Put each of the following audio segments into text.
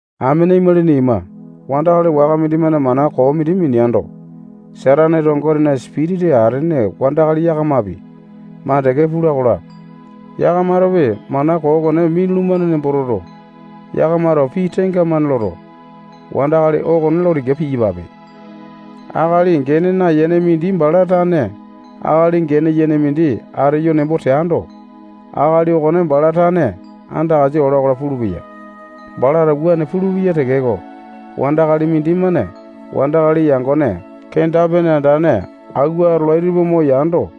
Amene imalini ima, wandakali waka mindimane mana koo mindi mineando, Sataneto Gotena Sipitisa atene wandakali yakamapi mandeke pula-kola, yakamatopi mana koo okone minulumane nembo toto, yakamato pii tenga-mane loto, wandakali okone lo tika piyapape. Akali gene nayene mindi bala tane akali gene yene mindi ateyo nembo teando, akali okone bala tane andakasa ola-kola pulupeya. Balato wuane pulupeya tekeko, wandakali mindimane wandakali yangone kenda-pene andane awua atolai tupa moyando,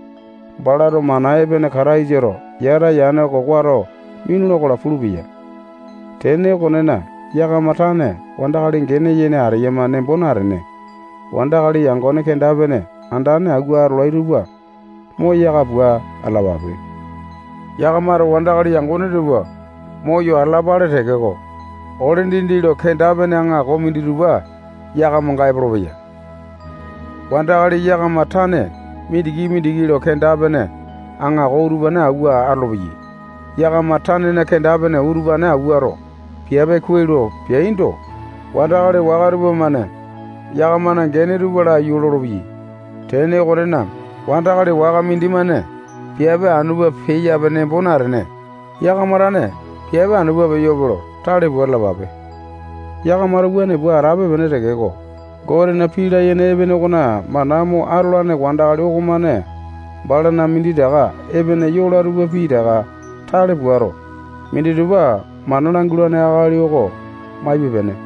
balato mana epene Kataisato yata yane oko wato minula-kola pulupeya. Tene okonena, yakama tane wandakali gene yene ateyama nembo natene, wandakali yangone kenda-pene andane awua atolai tupa moyaka pua atalapape. Yakamato wandakali yangone tupa moyo atalapale tekeko, ole dindi lo kenda-pene aŋako minditupa yakamanga epolopeya. Wandakali yakama tane mindiki-mindiki lo kenda-pene aŋako utupane awua atolopeyai. Yakama tanena kenda-pene utupane awuato, piape kuai lo peaindo, wandakali waka tupamane yakamana gene tupa laiyu lolopeyai. Tene okonena, wandakali waka mindimane piape anu peyape nembo natene, yakama tane piape anu peyope lo tale pua atalapape. Yakamato wuane pua atape-pene tekeko, Gotena pii layene epene okona mana mo atolane wandakali okomane balana minditaka epene yolane tupa pitaka tale puato, minditupa mana langulane akali oko maipe-pene.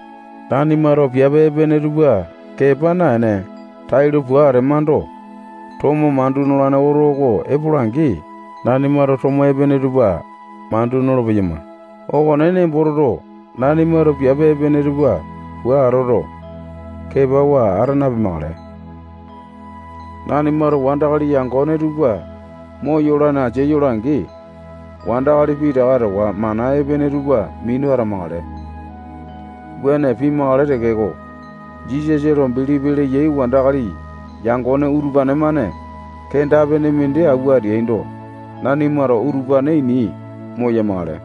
Nanimato piape epene tupa kepa naene, tailo pua atemando, tomo mandu nolane oto oko epola-angi, nanimato tomo epene tupa mandu nolo-peyama. Okone nembo toto, nanimato piape epene tupa pua atoto, kepawa ata napimakale. Nanimato wandakali yangone tupa moyolane asia yola-angi, wandakali pitaka towa mana epene tupa minu atamakale. Wuane pimakale tekeko, Jisasa lo bilipi leyai wandakali yangone utupane-mane kenda-pene mindi awua ateaindo, nanimato utupane ini moya-makale.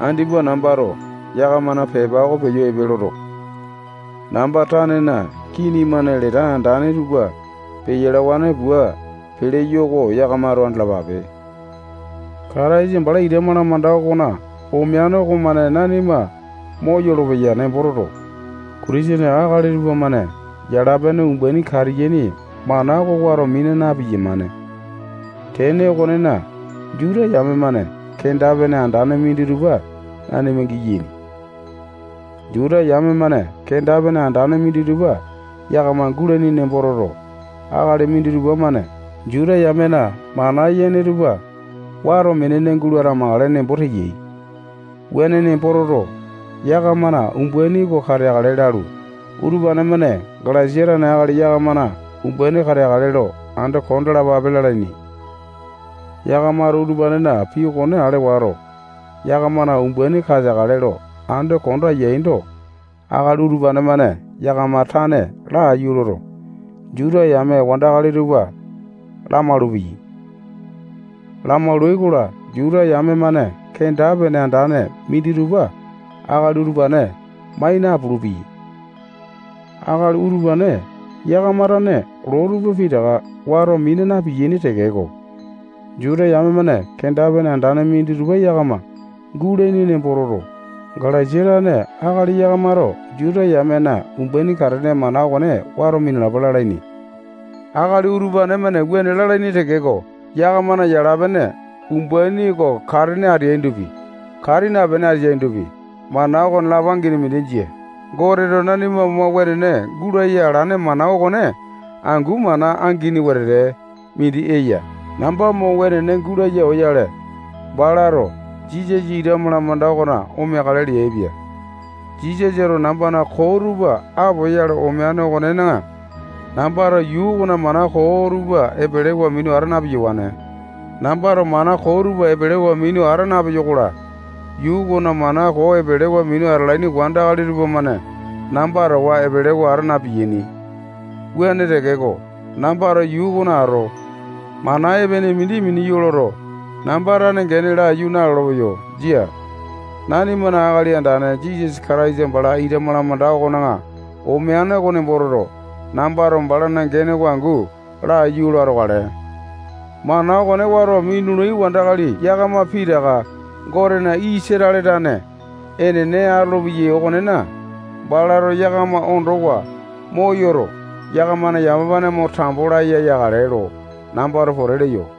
Andipa nambato yakamana pepa oko peyo epe loto, namba tanena kini-mane leta andane tupa peyalawane pua peleyo oko yakamato andalapape. Kataisa bala ita malamanda okona omeane okomane nanima moyolo-peya nembo toto, Kitisene akali tupamane yala-pene umbaini katiyaini mana oko wato mina na-piyamane. Tene okonena, Juta yame-mane kenda-pene andane minditupa nanima giyaini. Juta yame-mane kenda-pene andane minditupa yakama gulaini nembo toto, akali minditupa-mane Juta yamena mana yene tupa wato minene gulo atamakale nembo teyai. Wuane nembo toto, yakamana umbaini oko kateakale lalu, utupane-mane Galesia tane akali yakamana umbaini kateakale lo ando kondalapape lalaini. Yakamato utupanena pii okone ale wato, yakamana umbaini kateakale lo ando konda yaindo, akali utupane-mane yakama tane laiyu loto, Juta yame wandakali tupa lamalu-peyai. Lamaulai-kola, Juta yame-mane kenda-pene andane minditupa akali utupane mai napulu-peyai. Akali utupane yakama tane loo tupa pitaka wato mina na-piyaini tekeko, Juta yame-mane kenda-pene andane minditupa yakama gulaini nembo toto, Galesia tane akali yakamato Juta yamena umbaini katene mana okone wato minalapa lalaini. Akali utupane-mane wuane lalaini tekeko, yakamana yala-pene umbaini oko katene ateaindopi, kati napene ateaindopi, mana okonelapo angini mindi jia. Goteto nanima mo wenene gulaya alane mana okone angu mana angini wetete mindi eya. Namba mo wenene gulaya oyale, balato Jisasa ita malamanda okona omeakale leaipia. Jisasato nambana koo tupa apoyale omeane okonena, nambato yuu okona mana koo tupa epelewa minu ata na-piyawane. Nambato mana koo tupa epelewa minu ata napeyo-kola, yuu okona mana koo epelewa minu atalaini wandakali tupamane namba towa epelewa ata na-piyaini. Wuane tekeko, nambato yuu okona ato, mana epene mindi miniyo loto, namba tane gene laiyu nalolo-peyo. Jia. Nanimana akali andane Jisasa Kataisa bala ita malamanda okona omeane oko nembo toto, nambato balana gene oko angu laiyu lo atokale. Mana okone wato minulai wandakali yakama pitaka Gotena Isatale tane enene atolopeyai okonena, balato yakama ondowa moyoto, yakamana yamapane mo tambo laya yakale lo nambato pote leyo.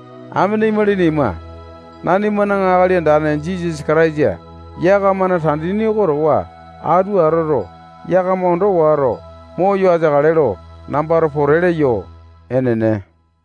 Amene imalini ima, nanimana Akali Andane Jisasa Kataisa yakamana tandini oko towa atu atoto, yakama ondo wato, moyo ateakale lo nambato pote leyo. Enene.